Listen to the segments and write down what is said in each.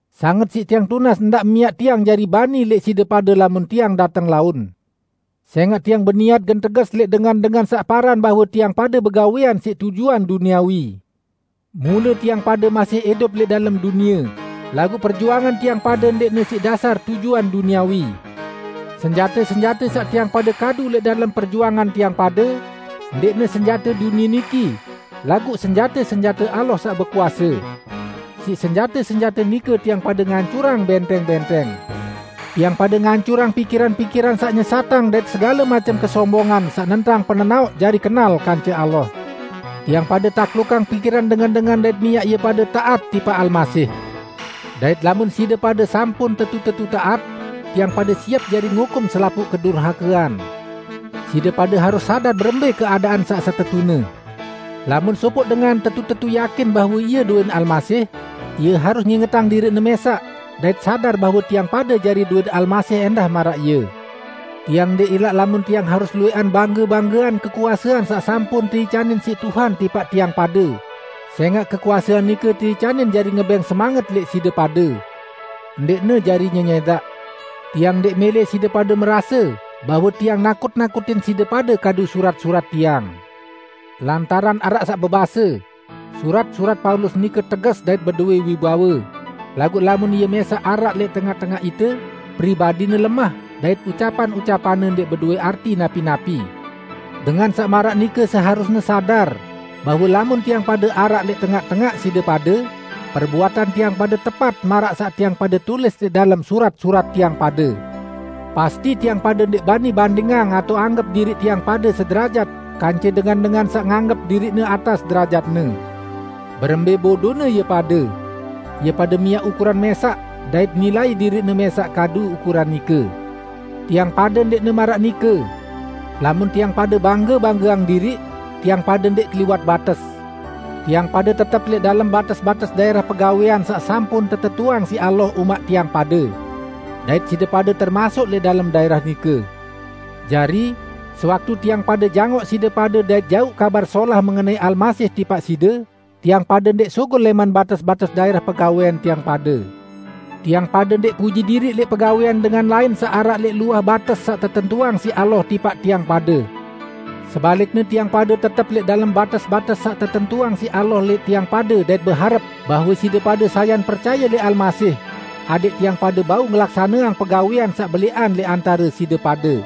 Sanget siq tiang tunas ndaq miaq tiang jari bani lẽq side pade lamun tiang dateng laun. Sẽngaq tiang beniat gen teges lẽq dengan-dengan saq paran bahwe tiang pade begawẽan siq tujuan duniawi. Mule tiang pade masih idup lẽq dalem dunie, laguq perjuangan tiang pade ndẽqne siq dasar tujuan duniawi. Senjate-senjate saq tiang pade kadu lẽq dalem perjuangan tiang pade ndẽqne senjate dunie niki, laguq senjate-senjate Allah saq bekuase. Siq senjate-senjate nike tiang pade ngancurang bẽntẽng-bẽntẽng. Tiang pade ngancurang pikiran-pikiran saq nyesatang dait segale macem kesombongan saq nentang penenaoq jari kenal kance Allah. Tiang pade taklukang pikiran dengan-dengan dait miaq ie pade taat tipaq Almasih. Dait lamun side pade sampun tetu-tetu taat, tiang pade siep jari ngukum selapuq kedurhakean. Side pade harus sadar berembẽ keadaan saq setetune. Lamun sopoq dengan tetu-tetu yakin bahwe ie dowẽn Almasih, ie harus ngingetang diriqne mẽsaq dait sadar bahwe tiang pade jari dowẽn Almasih ẽndah maraq ie. Tiang ndẽq ilaq lamun tiang harus luwẽqan bangge-banggeang kekuasean saq sampun teicanin siq Tuhan tipaq tiang pade, sẽngaq kekuasean nike teicanin jari ngebẽng semanget lẽq side pade, ndẽqne jari nyenyẽdaq. Tiang ndẽq mẽlẽ side pade merase bahwe tiang nakut-nakutin side pade kadu surat-surat tiang. Lantaran araq bebase, "Surat-surat Paulus nike teges dait bedowẽ wibawe, laguq lamun ie mẽsaq araq lẽq tengaq-tengaq ite, pribadine lemah dait ucapan-ucapanne ndẽq bedowẽ arti napi-napi!" Dengan saq maraq nike seharusne sadar bahwe lamun tiang pade araq lẽq tengaq-tengaq side pade, perbuatan tiang pade tepat maraq saq tiang pade tulis lẽq dalem surat-surat tiang pade. Pasti tiang pade ndẽq bani bandingang atao anggep diriq tiang pade sederajat kance dengan-dengan saq nganggep diriqne atas derajatne. Berembẽ bodone ie pade! Ie pade miaq ukuran mẽsaq dait nilai diriqne mẽsaq kadu ukuran nike. Tiang pade ndẽqne maraq nike. Lamun tiang pade bangge-banggeang diriq, tiang pade ndẽq keliwat bates. Tiang pade tetep lẽq dalem bates-bates daẽrah pegawẽan saq sampun tetentuang siq Allah umaq tiang pade. Dait side pade termasuk lẽq dalem daẽrah nike. Jari, sewaktu tiang pade jangoq side pade dait jauq Kabar Solah mengenai Almasih tipaq side, tiang pade ndẽq sugul lẽman bates-bates daẽrah pegawẽan tiang pade. Tiang pade ndẽq puji diriq lẽq pegawẽan dengan lain saq araq lẽq luah bates saq tetentuang siq Allah tipaq tiang pade. Sebalikne tiang pade tetep lẽq dalem bates-bates saq tetentuang siq Allah lẽq tiang pade dait beharep bahwe side pade sayan percaye lẽq Almasih, adẽq tiang pade bau ngelaksaneang pegawẽan saq belẽqan lẽq antare side pade.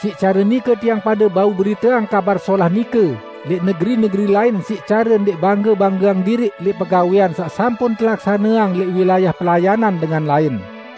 Siq care nike tiang pade bau beriteang Kabar Solah nike lẽq negeri-negeri lain siq care ndẽq bangge-banggeang diriq lẽq pegawẽan saq sampun telaksaneang lẽq wilayah pelayanan dengan lain.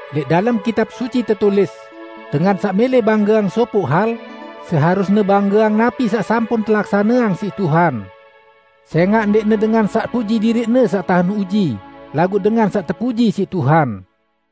Lẽq dalem Kitab Suci tetulis, "Dengan saq mẽlẽ banggeang sopoq hal, seharusne banggeang napi saq sampun telaksaneang siq Tuhan." Sẽngaq ndẽqne dengan saq puji diriqne saq tahen uji, laguq dengan saq tepuji siq Tuhan.